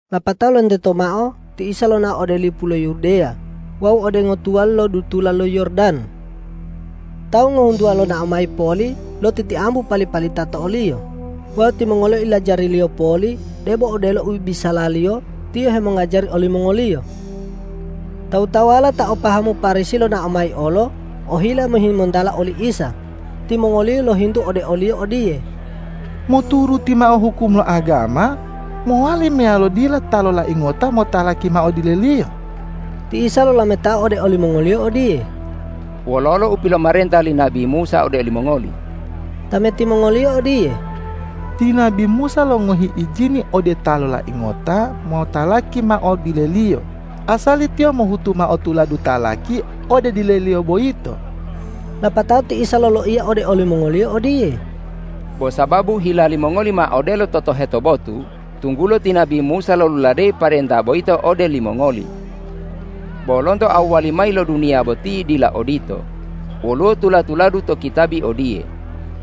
Lapatao lonteto mao ti Isa lonao ode lipu lo Yudeya wawu ode ngotuwali lo dutula lo Yordan. Tawu ngohuntuwa lonao mayi poli lotitiambu pali-palita to o-Liyo wawu timongoliyo ilajari-Liyo poli debo odelo u biyasaliyo Tiyo hemongajari olimongoliyo. Tawu-tawuwala ta o pahamu Parisi lonao mayi olo ohila mohimontala oli Isa. Timongoliyo lohintu ode o-Liyo odiye,”Moturuti mao hukum lo agama, mowali meyalo dila ta lolai ngota motalaki mao dileliyo?” Ti Isa lolametao ode olimongoliyo odiye,”Wololo u pilomarenta li nabi Musa ode limongoli?” Tameti mongoliyo odiye,”Ti nabi Musa longohi ijini ode ta lolai ngota motalaki mao dileliyo asali tiyo mohutu mao tuladu talaki ode dileliyo boyito.” Lapatao ti Isa loloiya ode olimongoliyo odiye,”Bo sababu hila limongoli ma odelo totoheto botu, tunggulo ti nabi Musa loluladeyi parenta boyito ode limongoli. Bo lonto awwali mayi lo duniya boti dila odito. Woluwo tula-tuladu to kitabi odiye,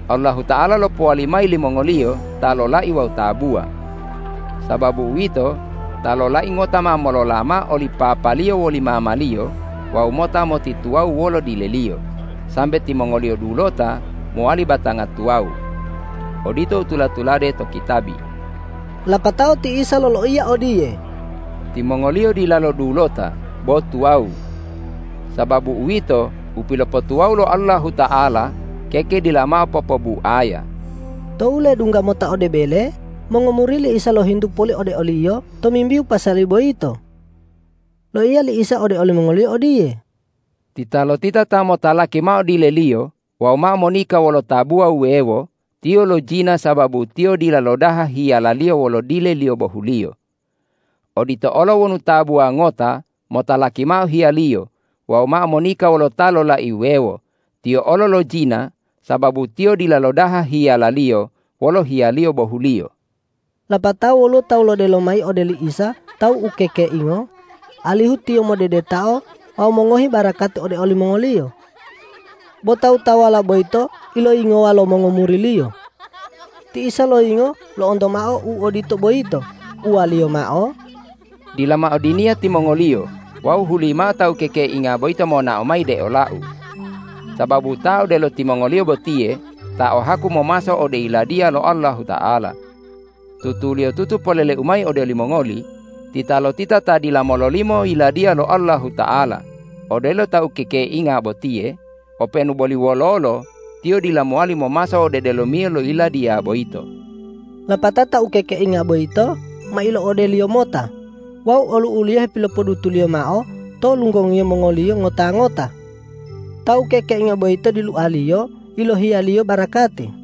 ’Allahuta'ala lopowali mayi limongoliyo ta lolai wawu tabuwa. Sababu uwito, ta lolai ngota ma molola mao oli papaliyo woli mamaliyo wawu mota motituwawu wolo dileliyo, sambe timongoliyo dulota mowali batanga tuwawu.’ Odito u tula-tulade to kitabi.” Lapatao ti Isa loloiya odiye,”Timongoliyo dilalo dulota bo tuwawu. Sababu uwito, u pilopotuwawu lo Allahuta'ala keke, dila mao popobuaya.” Tou ledungga mota ode bele, mongomuri li Isa lohintu poli ode o-Liyo tomimbihu pasali boyito. Loiya li Isa ode olimongoliyo odiye,”Titalotita ta motalaki mao dileliyo wawu mao monika wolo tabuwa wuwewo, tiyo lojina sababu tiyo dila lodaha hiyalaliyo wolo dileliyo bohuliyo. Odito olo wonu tabuwa ngota motalaki mao hiyaliyo wawu mao monika wolo ta lolai wuwewo, tiyo olo lojina sababu tiyo dila lodaha hiyalaliyo wolo hiyaliyo bohuliyo.” Lapatao woluwo tawu lodelo mayi ode li Isa ta ukekeingo, alihu Tiyo modedetao wawu mongohi barakati ode olimongoliyo. Bo tawu-tawuwala boyito iloyingowa lo mongomuri-Liyo. Ti Isa loyingo lo'onto mao u odito boyito, uwa-Liyo mao,”Dila mao diniya timongoliyo wawu hulimao ta ukekeinga boyito monao mayi de ola-U. Sababu ta odelo timongoliyo botiye ta o haku momaso ode Yiladiya lo Allahuta'ala. Tutuliyotutu polele-U mayi ode olimongoli: Titalotita ta dila mololimo Yiladiya lo Allahuta'ala odelo ta ukekeinga botiye, openu boli wololo tiyo dila mowali momaso ode delomiyo lo Yiladiya boyito.” Lapatao ta ukekeinga boyito ma ilo'ode-Liyo mota wawu olu'u-Liyo hepilopodutu-Liyo mao to lunggongi mongoliyo ngota-ngota. Ta ukekeinga boyito dilua-Liyo yilohiya-Liyo barakati.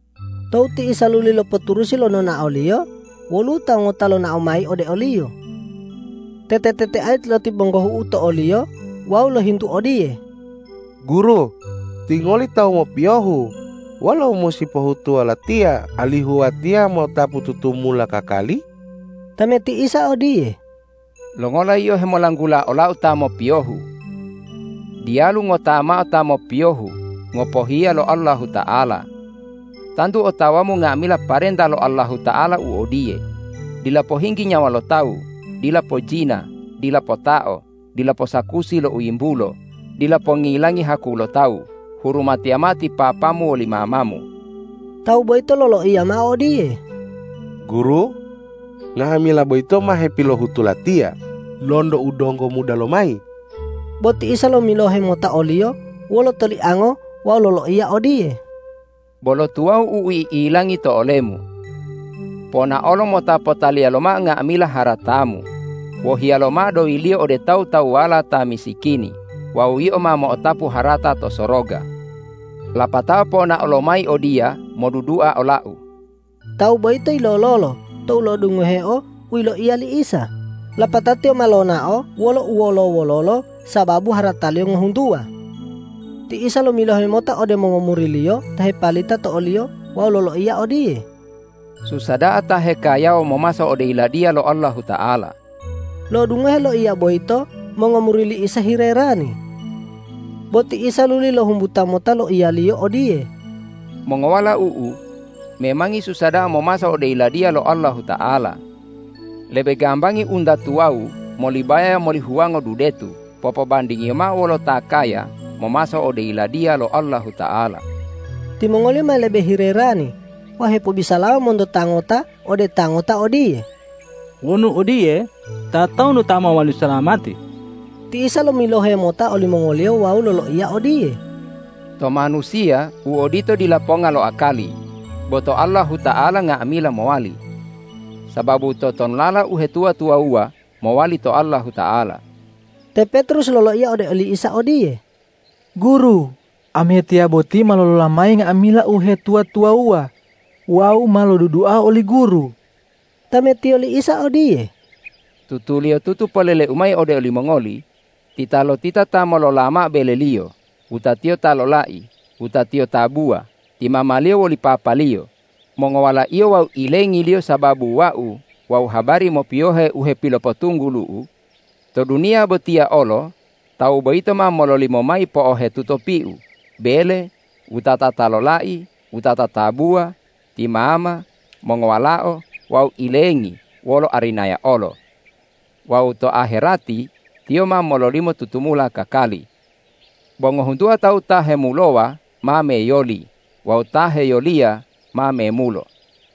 Tou ti Isa luli lopoturusi lo nonao-Liyo, woluwo tawu ngota lonao mayi ode o-Liyo, tete-teteayi lotibonggohu'u to talu-Liyo wawu lohintu odiye,”Guru, Tingoli tawu mopiyohu, wolo u musi pohutuwo latiya, alihu watiya mo'otapu tutumula kakali?” Tameti Isa odiye,”Longola yio hemolanggula ola-U ta mopiyohu? Diyalu ngota mao ta mopiyohu ngopohiya lo Allahuta'ala. Tantu otawamu nga'amila parenta lo Allahuta'ala u odiye: Dila pohinggi nyawa lo tawu, dila pojina, dila potao, dila posakusi lo u yimbulo, dila pongilangi haku lo tawu, hurumatiya mao ti papamu woli mamamu!” Tawu boyito loloiya mao odiye,”Guru, nga'amila boyito ma hepilohutu latiya lonto u donggo muda lomayi.” Bo ti Isa lomilohe mota oliyo wolo toliango wawu loloiya odiye,”Bolo tuwawu u i'ilangi to olemu. Ponaolo mota potaliya lomao nga'amila haratamu, wohiya lomao doyiliyo ode tawu-tawuwala ta misikini wawu yio ma mo'otapu harata to soroga. Lapatao ponao lomayi odiya modudua ola-U.” Tawu boyito yilololo tou lo'odungoheo u yiloiya li Isa, lapatao tiyo ma lonao wolo uwolo-wololo sababu harataliyo ngohuntuwa. Ti Isa lomilohe mota ode mongomuri-Liyo ta hepalita to o-Liyo wawu loloiya odiye,”Susa da'a ta hekayawa momaso ode Yiladiya lo Allahuta'ala.” Lo'odungoheo loiya boyito mongomuri li Isa hilerani. Bo ti Isa luli lohumbuta mota loiya-Liyo odiye,”Mongowalau-U, memangi susa da'a momaso ode Yiladiya lo Allahuta'ala. Lebe gambangi unta tuwawu molibaya moli huwango dudetu popobandingiyo mao wolo ta kaya momaso ode Yiladiya lo Allahuta'ala.” Timongoliyo ma lebe hilerani wawu hepobisalawa monto ta ngota ode ta ngota odiye,”Wonu odiye, tatonu ta mowali salamati?” Ti Isa lomilohe mota olimongoliyo wawu loloiya odiye,”To manusiya u odito dila ponga lo akali, bo to Allahuta'ala nga'amila mowali. Sababu totonulala uhetuwa-tuwawuwa mowali to Allahuta'ala.” Te Petrus loloiya ode oli Isa odiye,”Guru, amiyatiya boti ma lolola mayi nga'amila uhetuwa-tuwawuwa wawu ma lodudua oli Guru.” Tametiyo li Isa odiye,”Tutuliyotutu polele-U mayi ode olimongoli: Titalotita ta molola mao beleliyo, wutatiyo ta lolai, wutatiyo tabuwa, ti mamaliyo woli papaliyo, mongowalaiyo wawu ilengiliyo sababu Wau wawu habari mopiyohe u hepilopotunggulu-U, to duniya botiya olo tawu boyito ma mololimo mayi po'ohetuto piu, bele, wutata ta lolai, wutata tabuwa, ti mama, mongowalao wawu ilengi, wolo arinaya olo. Wawu to aherati tiyo ma mololimo tutumula kakali. Bo ngohuntuwa tawu ta hemulowa ma meyoli wawu ta heyoliya ma memulo.”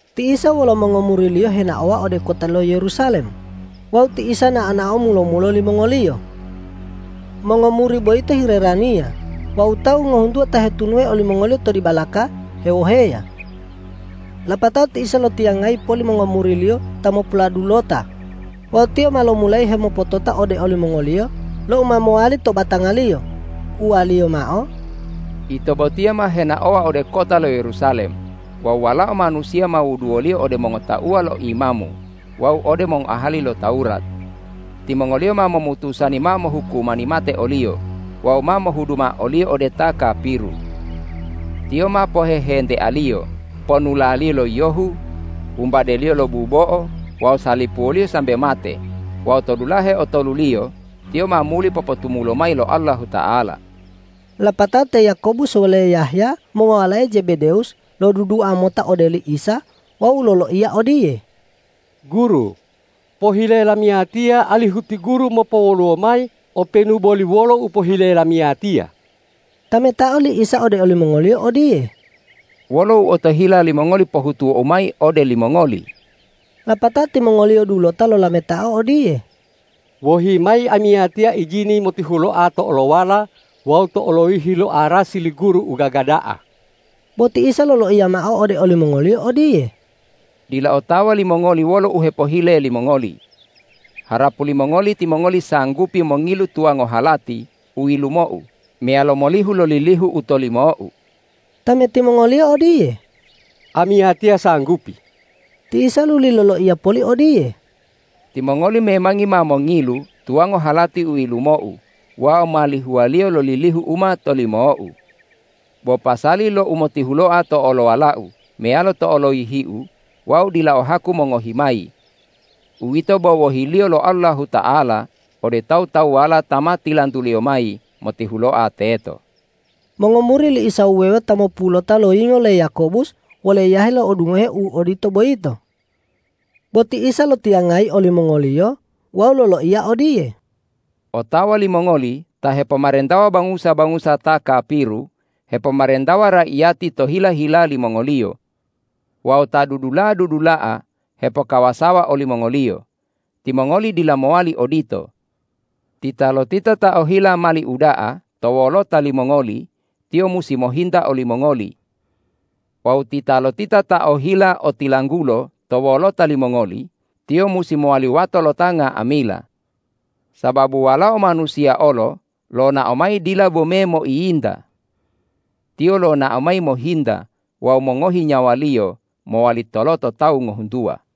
Ti Isa wolo mongomuri-Liyo henaowa ode kota lo Yerusalem wawu ti Isa nao-nao mulo-mulo limongoliyo. Mongomuri boyito hiheraniya wawu tawu ngohuntuwa ta hetunuhe olimongoliyo to dibalaka hewoheya. Lapatao ti Isa lotiyangayi poli mongomuri-Liyo ta mopuladulota wawu Tiyo ma lomulayi hemopotota ode olimongoliyo lo u ma mowali to batanga-Liyo. Uwa-Liyo mao,”Ito botiya ma henaowa ode kota lo Yerusalem wawu Walao Manusiya ma wuduwoliyo ode mongotauwa lo imamu wawu ode mongoahali lo Tawurat. Timongoliyo ma momutusani mao mohukumani mate o-Liyo wawu ma mohudu mao o-Liyo ode ta kapiru. Tiyo ma pohehentealiyo, ponulaliyo lo yiyohu, wumbadeliyo lo bubo'o wawu salipuwoliyo sambe mate wawu to dulahe otoluliyo Tiyo ma muli popotumulo mayi lo Allahuta'ala.” Lapatao te Yakobus wole Yahya mongowalae Zebedewus lodudula mota ode oli Isa wawu loloiya odiye,”Guru, pohile lamiyatiya alihu ti Guru mopowoluwo mayi openu boli wolo u pohile lamiyatiya!” Tametao li Isa ode olimongoliyo odiye,”Wolo u otohila limongoli pohutuwo-U mayi ode limongoli?” Lapatao timongoliyo dulota lolametao odiye,”Wohi mayi amiyatiya ijini motihuloa to olowala wawu to oloyihi lo arasi li Guru u gaga da'a.” Bo ti Isa loloiya mao ode olimongoliyo odiye,”Dila otawa limongoli wolo u hepohile limongoli. Harapu limongoli timongoli sanggupi mongilu tuwango halati u yilumo-U meyalo molihu lo lilihu u tolimo-U.” Tameti mongoliyo odiye,”Amiyatiya sanggupi.” Ti Isa luli loloiya poli odiye,”Timongoli memangi ma mongilu tuwango halati u yilumo-U wawu ma lihuwaliyo lo lilihu u ma tilolimo-U. Bo pasali lo umotihuloa to olowala-U meyalo to oloyihi-U Wau dila o haku mongohi mayi. Uwito bo wohi-Liyo lo Allahuta'ala ode tawu-tawuwala ta ma tilantu-Liyo mayi motihuloa teto.” Mongomuri li Isa wuwewo ta mopululota loyingo le Yakobus wole Yahya lo'odungoheo u odito boyito. Bo ti Isa lotiyangayi olimongoliyo wawu loloiya odiye,”Otawa limongoli ta hepomarentawa bangusa-bangusa ta kapiru hepomarentawa raiyati to hila-hila limongoliyo wawu ta dudula'a-dudula'a hepokawasawa olimongoliyo. Timongoli dila mowali odito. Titalotita ta ohila mali uda'a to wolota limongoli, tiyo musi mohinta olimongoli. Wawu titalotita ta ohila otilanggulo to wolota limongoli, tiyo musi mowali wato lo ta nga'amila. Sababu Walao Manusiya olo lonao mayi dila bome moiyinta. Tiyo lonao mayi mohinta wawu mongohi nyawa-Liyo mowali toloto tawu ngohuntuwa.”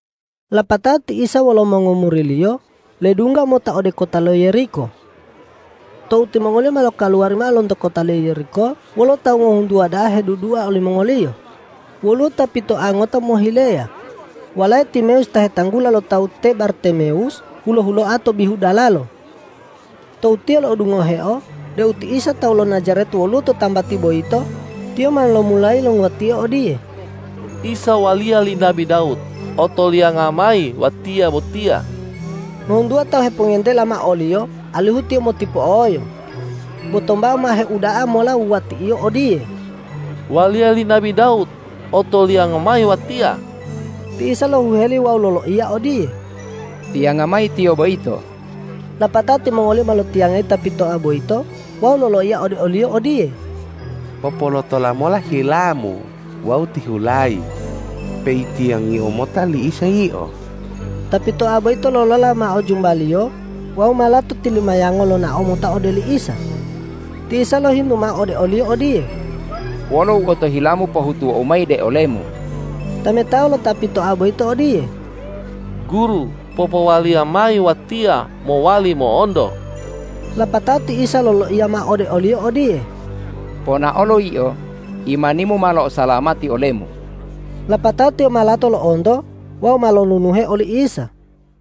Lapatao ti Isa wolo mongomuri-Liyo ledungga mota ode kota lo Yeriko. Tou timongoliyo ma lokaluwari mao lonto kota lo Yeriko wolo tawu ngohuntuwa da'a hedudua olimongoliyo, woluwo ta pitoa ngota mohileya, walae Timewus ta hetanggula lo tawu te Bartimewus hulo-huloa to bihu dalalo. Tou tiyo lo'odungoheo deu ti Isa tawu lo Najaret woluwo to tambati boyito, tiyo ma lomulayi longuwatio odiye,”Isa waliya li nabi Dawud, otolianga mayi watiya botiya!” Ngohuntuwa tawu hepongentela mao oliyo alihu tiyo motipo'oyo. Bo tombao ma heuda'a mola wuwati'iyo odiye,”Waliya li nabi Dawud, otolianga mayi watiya!” Ti Isa lohuheli wawu loloiya odiye,”Tiyanga mayi tiyo boyito.” Lapatao timongoliyo ma lotiyangayi ta pitoa boyito wawu loloiya ode oliyo odiye,”Popolotola mola hilamu wawu tihulayi, peitiyangiyo mota li Isa yio.” Ta pitoa boyito lolola mao jumbaliyo wawu ma lato tilumayango lonao mota ode li Isa. Ti Isa lohintu mao ode oliyo odiye,”Wolo u otohilamu pohutuwo-U mayi de olemu?” Tametao lo ta pitoa boyito odiye,”Guru, popowaliya mayi watiya mowali mo'onto!” Lapatao ti Isa loloiya mao ode oliyo odiye,”Ponaolo yio, imanimu ma lo'osalamati olemu!” Lapatao tiyo ma lato lo'onto wawu ma lolunuhe oli Isa.